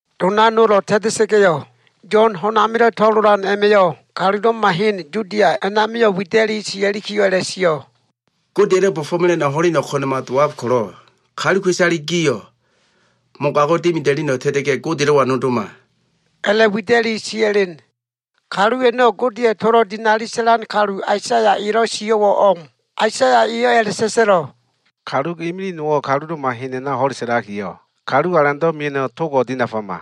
Dona nolo꞉ ta꞉ta꞉sa꞉ga꞉yo꞉, Yo꞉n ho꞉n amilo꞉ to꞉lolan a꞉ma꞉yo꞉ kalulo꞉ma hen Yudia a꞉namio꞉ wida꞉li sia꞉likiyo꞉ a꞉la꞉sio꞉, “Godeya꞉lo꞉ bo꞉fo꞉mela꞉no꞉ ho꞉leno꞉ ko꞉na꞉ma dowab ko꞉lo꞉, kaluka꞉isale gio꞉ mogago꞉ dimida꞉leno꞉ ta꞉ta꞉ga꞉, Godelo꞉wa nodoma” a꞉la꞉wida꞉li sia꞉len. Kalu a꞉no꞉ Godeya꞉ tolo꞉ dinali sa꞉lan kalu Aisaya elo꞉ sio꞉wo꞉ o꞉m. Aisaya eyo꞉ a꞉la꞉sa꞉sa꞉lo꞉, “Kalu imilig nowo꞉ kalulo꞉ma hen a꞉na ho꞉le sa꞉lakiyo꞉, ‘Kalu Alando꞉ mia꞉no꞉ togo꞉ dinafama.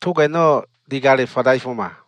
Tog a꞉no꞉ digale fadaifoma.’”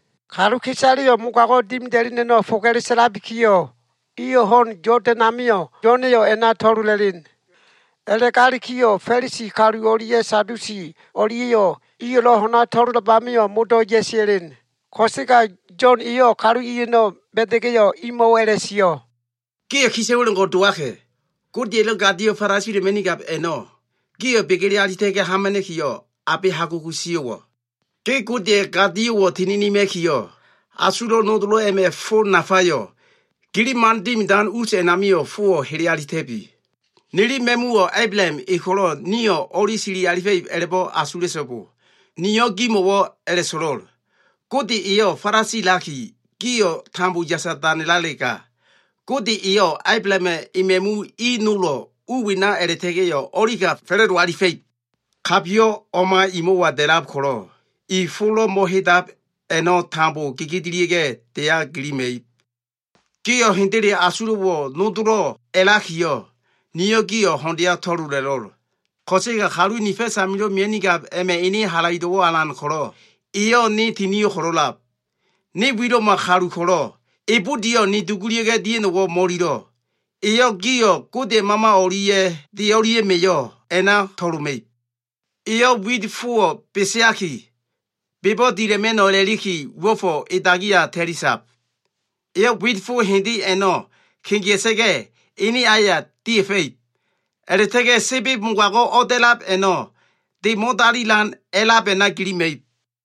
Kaluka꞉isaleyo꞉ mogago꞉ dimida꞉leno꞉ foga꞉le sa꞉labikiyo꞉, iyo꞉ ho꞉n Yodan amio꞉ Yo꞉na꞉yo꞉ a꞉na to꞉lola꞉len. A꞉la꞉ga꞉likiyo꞉, Fa꞉lisi kalu o꞉lia꞉ Sadusi o꞉lia꞉yo꞉ iyo꞉lo꞉ ho꞉na to꞉lolab amio꞉ modo꞉ ya꞉sia꞉len. Ko꞉sega Yo꞉n eyo꞉ kalu i a꞉no꞉ ba꞉da꞉ga꞉yo꞉, imo꞉wo꞉ a꞉la꞉sio꞉, “Gio꞉ kisa꞉wa꞉lo꞉ o꞉ngo꞉ dowaka꞉! Godeya꞉lo꞉ gadiakilo꞉ falasila꞉ma꞉nigab a꞉no꞉, gio꞉ begele alita꞉ga꞉ hamana꞉kiyo꞉ abe hagugu sio꞉wo꞉? Ge Godeya꞉ gadio꞉wo꞉ tininima꞉nikiyo꞉, asulo꞉ nodolo꞉ a꞉ma꞉ fo nafayo꞉, gililo꞉ man dimidan us a꞉namio꞉ fowo꞉ hele alita꞉bi. Nili ma꞉muwo꞉ Ablaham e ko꞉lo꞉ nio꞉ o꞉li sili alifa꞉no꞉ a꞉la꞉bo꞉ giliyo꞉ asula꞉so꞉bo. Niyo꞉ gimo꞉wo꞉ a꞉la꞉so꞉lo꞉l. Gode eyo꞉ falasilakiyo꞉, gio꞉ tambo yasa danelalega, Gode eyo꞉ Ablahama꞉ ema꞉mu i nolo꞉ u wena a꞉la꞉ta꞉ga꞉yo꞉ o꞉lika fa꞉la꞉do alifa꞉ib. Kabiyo꞉ o꞉ma i mo꞉wa dia꞉fo꞉lab ko꞉lo꞉, iyo꞉ tambo fo nafalo꞉ mo꞉hedab a꞉no꞉ gegedelia꞉ga꞉ deya gilima꞉ib. “Gio꞉ hendele asulo꞉wo꞉ nodolo꞉ a꞉lakiyo꞉, niyo꞉ gio꞉ ho꞉ndeya to꞉lola꞉lo꞉l. Ko꞉sega kalu ni fa꞉s amilo꞉ mia꞉nigab a꞉ma꞉ ene halaido꞉wo꞉ alan ko꞉lo꞉, eyo꞉ ne tinio꞉ ko꞉lo꞉lab. Ne wilo꞉ma kalu ko꞉lo꞉, e budiyo꞉ ni dugulia꞉ga꞉ dia꞉no꞉wo꞉ mo꞉ililo꞉. Eyo꞉ gio꞉ Godeya꞉ Mama o꞉lia꞉ de o꞉lia꞉ma꞉yo꞉ a꞉na to꞉loma꞉ib. Eyo꞉ wit fowo꞉ beseaki, bebo꞉ dila꞉ma꞉no꞉ a꞉la꞉liki, uo꞉fo꞉ e dagi amio꞉ ta꞉li sab. Eyo꞉ wit fo hende a꞉no꞉ kegea꞉sa꞉ga꞉, ene aya dia꞉fa꞉ib. A꞉la꞉ta꞉ga꞉ sebeb mogago꞉ o꞉da꞉lab a꞉no꞉, de mo꞉dalima꞉no꞉ a꞉lab a꞉na gilima꞉ib.”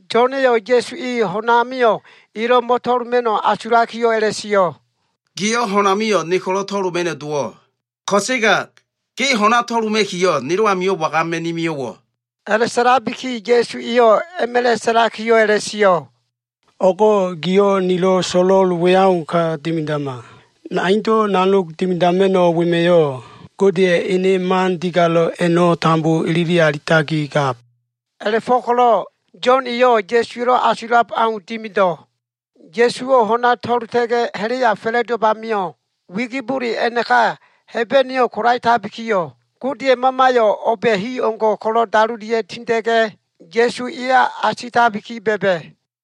Yo꞉na꞉yo꞉ Ya꞉su e ho꞉n amio꞉ elo꞉ mo꞉to꞉loma꞉no꞉ asulakiyo꞉ a꞉la꞉sio꞉, “Giyo꞉ ho꞉n amio꞉ ne ko꞉lo꞉ to꞉loma꞉no꞉ dowo꞉. Ko꞉sega ge ho꞉na to꞉loma꞉kiyo꞉ nelo꞉ amio꞉ wagama꞉ni mio꞉wo꞉?” A꞉la꞉sa꞉labiki Ya꞉su eyo꞉ a꞉ma꞉la꞉ sa꞉lakiyo꞉ a꞉la꞉sio꞉, “O꞉go꞉ giyo꞉ nilo꞉ so꞉lo꞉l we au ka dimidama. Naindo꞉ nanogo꞉ dimidama꞉no꞉ wema꞉yo꞉, Godeya꞉ ene man digalo꞉ a꞉no꞉ tambo ilili alitakigab.” A꞉la꞉fo꞉ko꞉lo꞉ Yo꞉n eyo꞉ Ya꞉suwa꞉lo꞉ asulab au dimido꞉. Ya꞉suwo꞉ ho꞉na to꞉lota꞉ga꞉ ha꞉la꞉ya fa꞉la꞉dowab a꞉namio꞉, wigibole a꞉naka Hebeneyo꞉ kolaetabikiyo꞉, Godeya꞉ Mamayo꞉ o꞉ba꞉ hi o꞉ngo꞉ ko꞉lo꞉ dalolia꞉ tinda꞉ga꞉, Ya꞉su eya asitabiki ba꞉ba꞉.